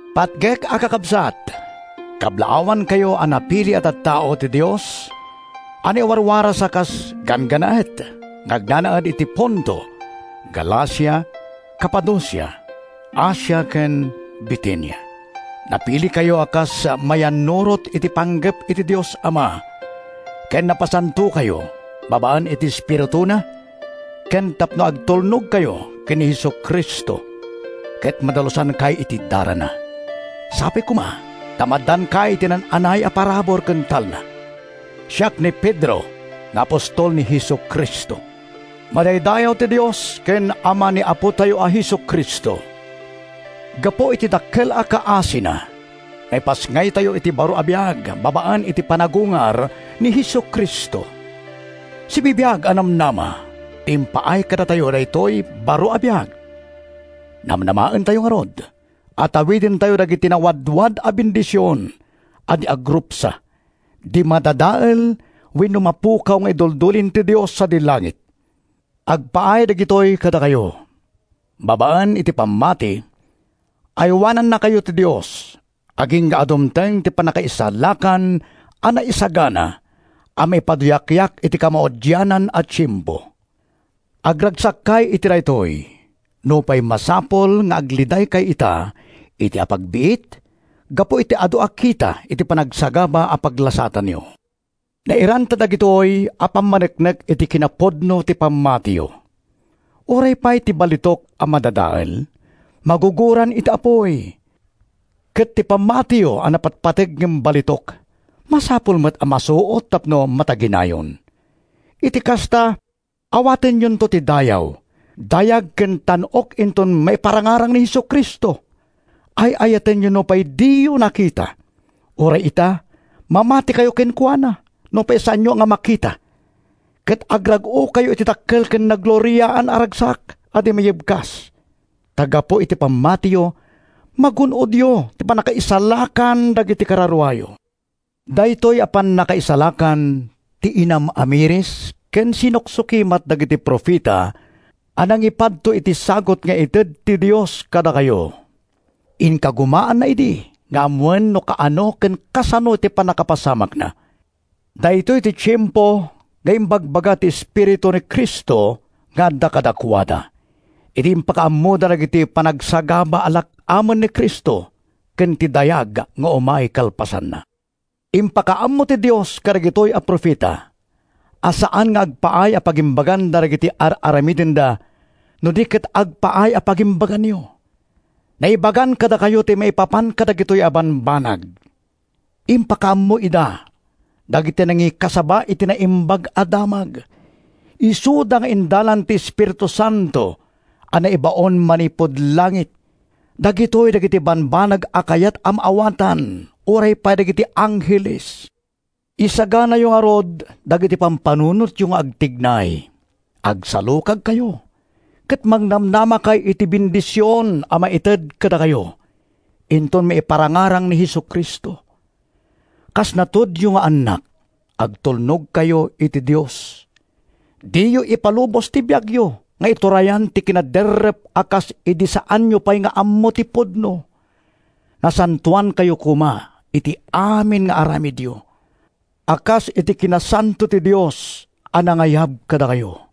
Patgek a Kakabsat: Kablaawankayo a napili a tattao ti Dios a naiwaraswaras a kas ganggannaet nga agnanaed iti Ponto, Galacia, Capadocia, Asia ken Bitinia. Napilikayo a kas mayannurot iti panggep ti Dios Ama ken napasantokayo babaen iti Espirituna ken tapno agtulnogkayo ken ni Jesu-Cristo ket madalusankay iti darana. Sapay koma ta maaddaankay iti naan-anay a parabur ken talna. Siak ni Pedro nga apostol ni Jesu-Cristo. Madaydayaw ti Dios ken Ama ni Apotayo a Jesu-Cristo! Gapu iti dakkel a kaasina, naipasngaytayo iti baro a biag babaen iti panagungar ni Jesu-Cristo. Sibibiag a namnama ti impaay kadatayo daytoy baro a biag. Namnamaentayo ngarud a tawidentayo dagiti nawadwad a bendision a di agrupsa, di madadael wenno mapukaw nga iduldulin ti Dios sadi langit. Agpaay dagitoy kadakayo. Babaen iti pammati, aywanannakayo ti Dios agingga a dumteng ti pannakaisalakan a naisagana a maipaduyakyak iti kamaudianan a tiempo. Agragsakkay iti daytoy, nupay masapul nga aglidaykay ita iti apagbiit gapu iti adu a kita ti panagsagaba a paglasatanyo. Nairanta dagitoy a pangpaneknek iti kinapudno ti pammatiyo. Uray pay ti balitok a madadael, magugoran iti apuy. Ket ti pammatiyo a napatpateg ngem balitok, masapul met a masuot tapno mataginayon. Iti kasta, awatenyonto ti dayaw, dayag ken tan-ok inton maiparangarang ni Jesu-Cristo. Ay-ayatenyo nupay diyo nakita. Uray ita, mamatikayo kenkuana nupay saanyo a makita, ket agrag-okayo iti dakkel ken nagloriaan a ragsak a di mayebkas, ta gapu iti pammatiyo, magun-odyo ti pannakaisalakan dagiti kararuayo. Daytoy a pannakaisalakan ti inam-amiris ken sinuksukimat dagiti profeta a nangipadto iti sagut nga ited ti Dios kadakayo. Inkagumaanda idi nga ammoen no kaano ken kasano ti pannakapasamakna. Daytoy ti tiempo nga imbagbaga ti Espiritu ni Cristo nga adda kadakuada, idi impakaammoda dagiti panagsagaba a lak-amen ni Cristo ken ti dayag nga umay kalpasanna. Impakaammo ti Dios kadagitoy a profeta a saan nga agpaay a pagimbaganda dagiti ar-aramidenda no di ket agpaay a pagimbaganyo. Naibagan kadakayo ti maipapan kadagitoy a bambanag. Impakaammo ida dagiti nangikasaba iti Naimbag a Damag, isuda nga indalan ti Espiritu Santo a naibaon manipud langit. Dagitoy dagiti bambanag a kayat a maawatan uray pay dagiti angheles. Isaganayo ngarud dagiti panunotyo nga agtignay. Agsalukagkayo ket mangnamnamakay iti bendision a maited kadakayo inton maiparangarang ni Jesu-Cristo. Kas natudio nga annak, agtulnogkayo iti Dios. Diyo ipalubos ti biagyo nga iturayan ti kinaderrep a kas idi saanyo pay nga ammo ti pudno. Nasantoankayo koma iti amin nga aramidyo, a kas iti kinasanto ti Dios a nangayab kadakayo.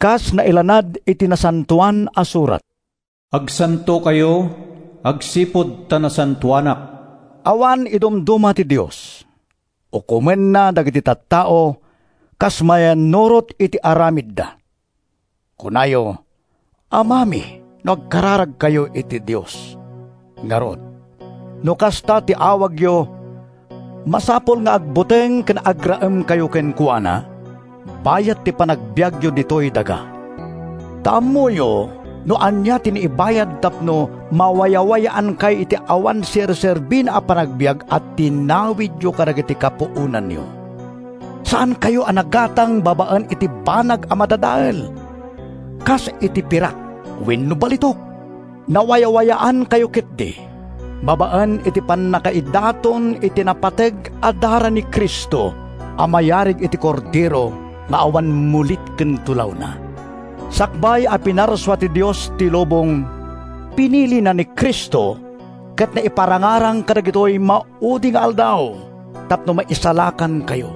Kas nailanad iti Nasantoan a Surat: “Agsantokayo, agsipud ta nasantoanak.” Awan idumduma ti Dios. Ukomenna dagiti tattao kas mayannurot iti aramidda. Kunayo, “Amami” no agkararagkayo iti Dios. Ngarud, no kasta ti awagyo, masapul nga agbuteng ken agraemkayo kenkuana bayat ti panagbiagyo ditoy daga. Ta ammoyo no ania ti naibayad tapno mawayawayaankay iti awan serserbina a panagbiag a tinawidyo kadagiti kapuonanyo. Saankayo a nagatang babaen iti banag a madadael, kas iti pirak wenno balitok. Nawayawayaankayo ketdi babaen iti pannakaidaton iti napateg a dara ni Cristo a mayarig iti kordero nga awan mulit ken tulawna. Sakbay a pinarsua ti Dios ti lubong, pinilina ni Cristo ket naiparangarang kadagitoy maudi nga aldaw tapno maisalakankayo.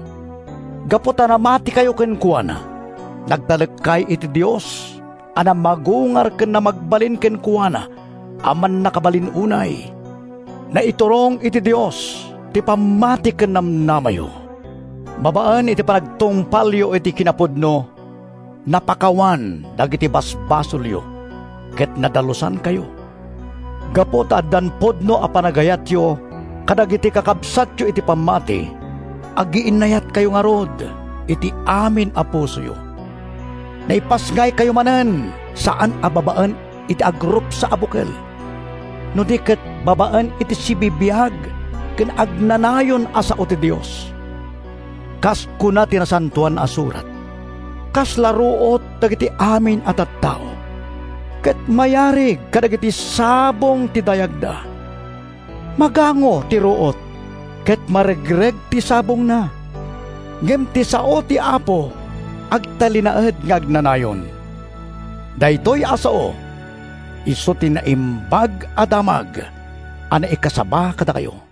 Gapu ta namatikayo kenkuana, nagtalekkay iti Dios a namagungar ken namagbalin kenkuana a mannakabalin unay. Naiturong iti Dios ti pammati ken namnamayo. Babaen iti panagtungpalyo iti kinapudno, napakawan dagiti basbasolyo ket nadalusankayo. Gapu ta addan pudno a panagayatyo kadagiti kakabsatyo iti pammati, agiinnayatkayo ngarud iti amin a pusoyo. Naipasngaykayo manen saan a babaen iti agrupsa a bukel no di ket babaen iti sibibiag ken agnanayon a sao ti Dios. Kas kuna ti Nasantoan a Surat: “Kasla ruot dagiti amin a tattao Ket mayarig kadagiti sabong ti dayagda, Magango ti ruot, ket maregreg ti sabongna Ngem ti sao ti Apo agtalinaed nga agnanayon.” Daytoy a sao isu ti Naimbag a Damag a naikasaba kadakayo.